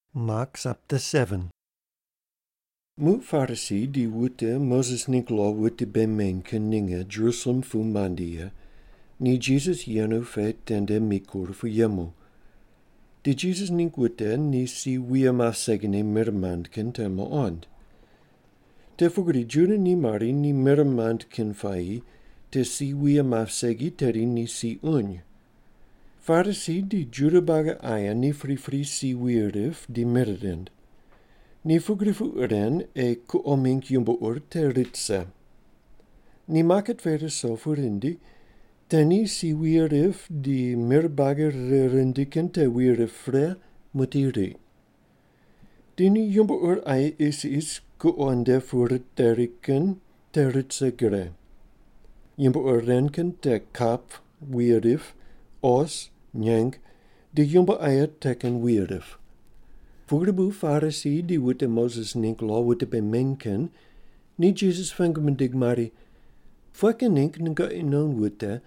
Muq Parisi di wute Moses ningg lo wute bei meny kin ninge Jerusalem pu mandi ye, ni Jisas yenu pe tende mikur pu yemu. Ni Jisas ningg wute ni si wuye map segine mir mand kin te muqond. Te pugri Juda ni mari ni mir mand kin puayi te si wuye map segi tedi ni si uny. Parisi di Juda buagi aye ni pripri si wuye rip di mir rind. Ni pugri puq ren ei kuqo mingg yumbo ur te rit rise. Ni maket pe ruso pu rindi, te ni si wuye rip di mir buagi rire rindi kin te wuye rip pre muqdi riq. Di ni yumbo ur aye isis kuqo nde pu riteri kin te rit rise gre. Yumbo ur ren kin te kap wuye rip, os, nyeng di yumbo aye te kin wuye rip. Pugri bu Parisi di wute Moses ningg lo wute bei meny kin ni Jisas pengu mindig mari, “Pughe kin ningg nunon wute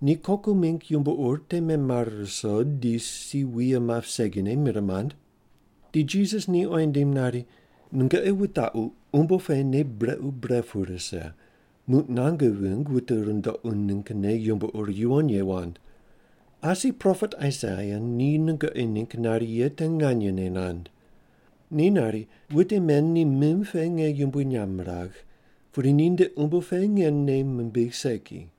ni koku mingg yumbo ur te memare ruso di si wuye map segine mir mand?” Di Jisas ni oyi nindim nari, “Nungoqi wutaqu umbo pe nei brequ bre pu rise muq nange vingg wute rundoqu ninggne yumbo ur yuwon ye wand. Asi propet Aisaia ni nungoqi ningg nari ye te nganyene nand. Ni nari, ‘Wute men ni mim pe nge yumbui nyamb miragh, pudi ninde umbo pe nge nei mimbigh segi.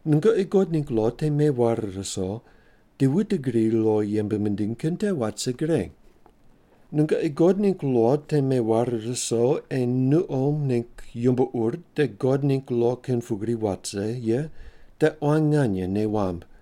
Nungoqi God ningg lo te meware ruso di wute gri lo yembe mindiny kin te wat rise gre. “Nungoqi God ningg lo te meware ruso ei nuqo ningg yumbo ur te God ningg lo kin pugri wat rise ye te quan nganye nei wamb.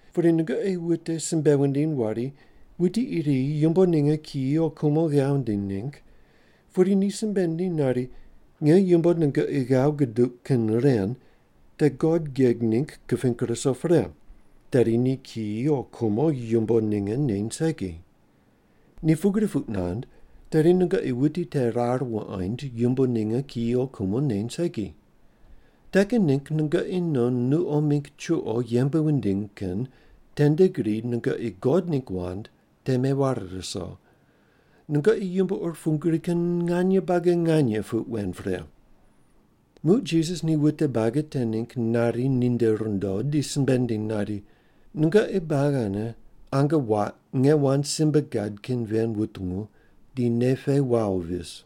Pudi nungoqi wute simbe wundiny wari wuti iri yumbo ninge kiyi o kumo ghav nindiny ningg, pudi ni simbe nindiny nari, ‘Nge yumbo nungoqi ghav guduq kin ren te God geg ningg kiping ruso pre,’ tedi ni kiyi o kumo yumbo ninge neny segi. Ni pugri puq nand tedi nungoqi wuti te rar wuqoind yumbo ninge kiyi o kumo neny segi. Te kin ningg nungoqi non nuqo mingg chuqo yembe wundiny kin tende gri nungoqi God ningg wand te meware ruso. Nungoqi yumbo ur pugri kin nganye buagi nganye puq wen pre.” Muq Jisas ni wute buagi te ningg nari ninde rundo di simbe nindiny nari, “Nungoqi buagi ane ange waq nge wand simbe gad kin ven wutungu di nei pe wawo vis.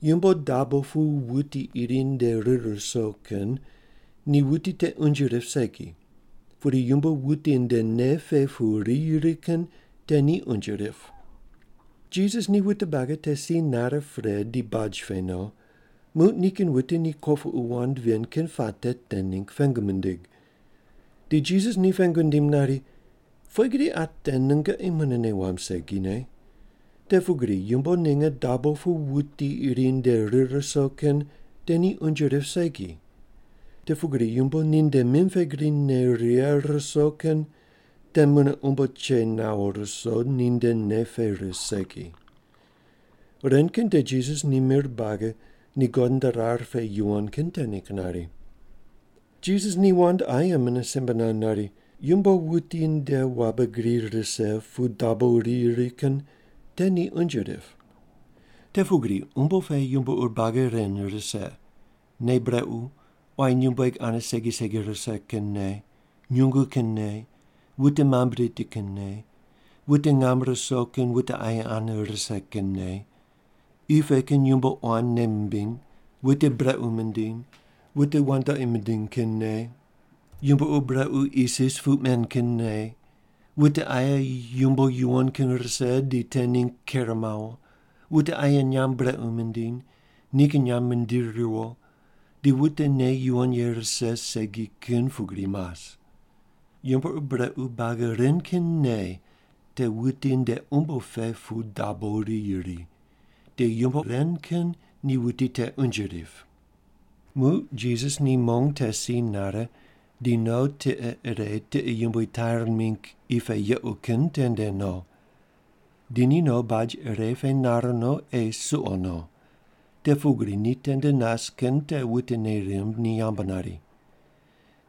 Yumbo dabo pu wuti iri nde rir ruso kin ni wuti te unje rip segi. Pudi yumbo wuti nde nei pe pu riyi ri kin te ni unje rip.” Jisas ni wute buagi te si nare pre di baj pe no, muq nikin wute ni kopuqu wand ven kin puate te ningg pengu mindig. Di Jisas ni pengu nindim nari, “Pughe gri ate nungoqi mune nei wamb segine? Te pugri yumbo ninge dabo pu wuti iri nde rir ruso kin te ni unje rip segi. Te pugri yumbo ninde mim pe gri ne righe ruso kin te mune umbo che nawo ruso, ninde nei pe ris segi.” (Ren kin te Jisas ni mir buagi ni God nde rar pe yuwon kin te ningg nari.) Jisas ni wand aye mune simbe nand nari, “Yumbo wuti nde wabe gri rise pu dabo riyi ri kin te ni unje rip. Te pugri umbo pe yumbo ur buagi ren rise: nei brequ, quayi nyumbueg ane segi segi rise kin nei, nyungu kin nei, wute mamb riti kin nei, wute ngam ruso kin wute aye ane rise kin nei, qi pe kin yumbo quan nei mimbiny, wute brequ mindiny, wute wandoqi mindiny kin nei, yumbo ur brequ isis puq men kin nei, wute aye yumbo yuwon kin rise di te ningg ker mawo, wute aye nyamb brequ mindiny, nikin nyamb mindiri ruwo, di wute nei yuwon ye rise segi kin pugri mas. Yumbo ur brequ buagi ren kin nei te wuti nde umbo pe pu dabo riyi ri. Di yumbo ren kin ni wuti te unje rip.” Muq Jisas ni mong te si nare di no tiqe ire tiqe yumbui Tair mingg qi pe yequ kin tende no. Di ni no baj ire pe nar no ei suqo no, te pugri ni tende nas kin te wute nei rimb ni yambu nari.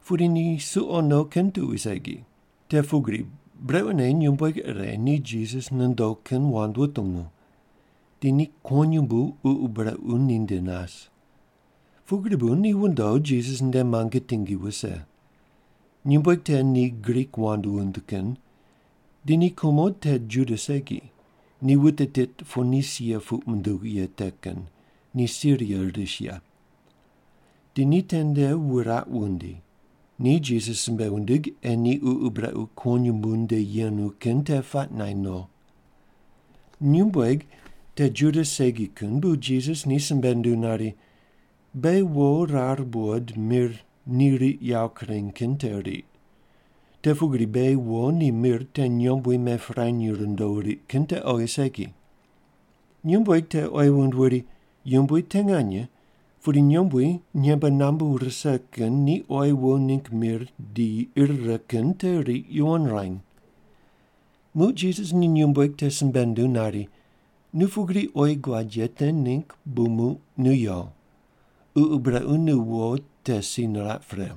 Pudi ni suqo no kin tuqui segi. Te pugri, brequne nyumbueg ire ni Jisas nondo kin wand wutungu. Di ni kuwonyumbu ququ brequ ninde nas. Pugri bu ni wundo Jisas nde muange tingi wuse. Nyumbueg te ni Grik wand wund kin. Di ni kumo te Juda segi, ni wute tit Ponisia puq munduw ye te kin, ni Siria ris ye. Di ni tende wuraq wundi. Ni Jisas simbe wundig ei ni ququ brequ kuwonyumbu nde yenu kin te puaq naind no. Nyumbueg te Juda segi kin bu Jisas ni simbe nunduw nari, “Beghi wo rar buqod mir ni riq yawo kureny kin te riq. Te pugri beghi wo ni mir te nyombui mepirany rundo riq kin te oghi segi.” Nyumbueg te oyi wund wuri, “Yumbui te nganye, pudi nyombui nyembe nambu rise kin ni oyi wo ningg mir di ir righe kin te riq yuwon ruany.” Muq Jisas ni nyumbueg te simbe nunduw nari, “Nu pugri oyi guad ye te ningg bu muq nu yo. Ququ brequ ni nu wo te si niraq pre.”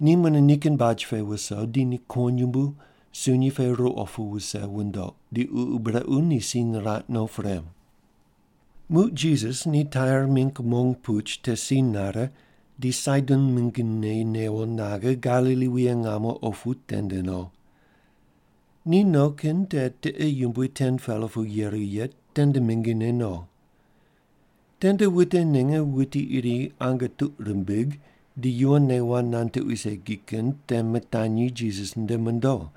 Ni mune nikin baj pe wuso di ni kuwonyumbu sunyi pe ruqo pu wuse wundoq, di ququ brequ ni si niraq no pre. Muq Jisas ni Tair mingg mong puch te si nare di Saidon mingine newo naghe Galili wuye ngamo opu tende no. Ni no kin te tiqe yumbui 10-pela pu yeru ye tende mingine no. Tende wute ninge wuti iri ange tuq rimbig di yuwonne wand nand tuqui segi kin te mitanyi Jisas nde mondo.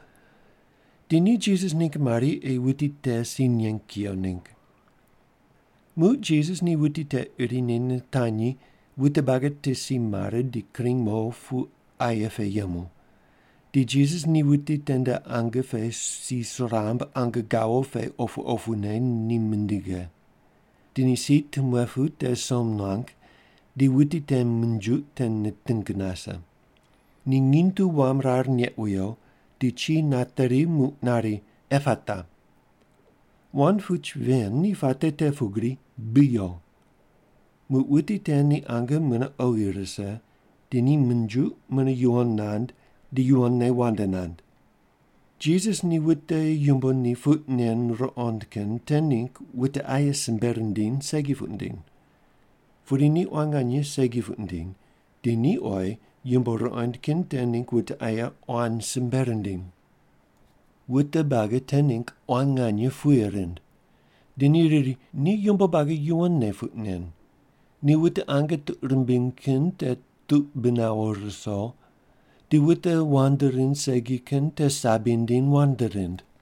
Di ni Jisas ningg mari ei wuti te si neng kuyo ningg. Muq Jisas ni wuti te irine nitanyi wute buagi te si mare di kring mo pu aye pe yemu, di Jisas ni wuti tende ange pe si suramb ange gawo pe opu opune ni mindighe. Di ni si tumuepu te som nuang di wuti te minjuq te niting nase. Ni nginy tu wam rar neq wiyo, di chi nateri muq nari, “Epata.” (Wand puch ven ni puate te pugri, “Bi yo.”) Muq wuti te ni ange mune oghi rise, di ni minjuq mune yuwon nand di yuwonne wand nand. Jisas ni wute yumbo ni puq nen ruqond kin te ningg wute aye simbe rindiny segi puq nindiny. Pudi ni quan nganye segi puq nindiny, di ni oyi yumbo ruqond kin te ningg wute aye quan simbe rindiny. Wute buagi te ningg quan nganye puye rind. Di ni riri, “Ni yumbo buagi yuwonne puq nen. Ni wute ange tuq rimbiny kin te tuq bi nawo ruso, di wute wand rind segi kin te sabi nindiny wand rind.”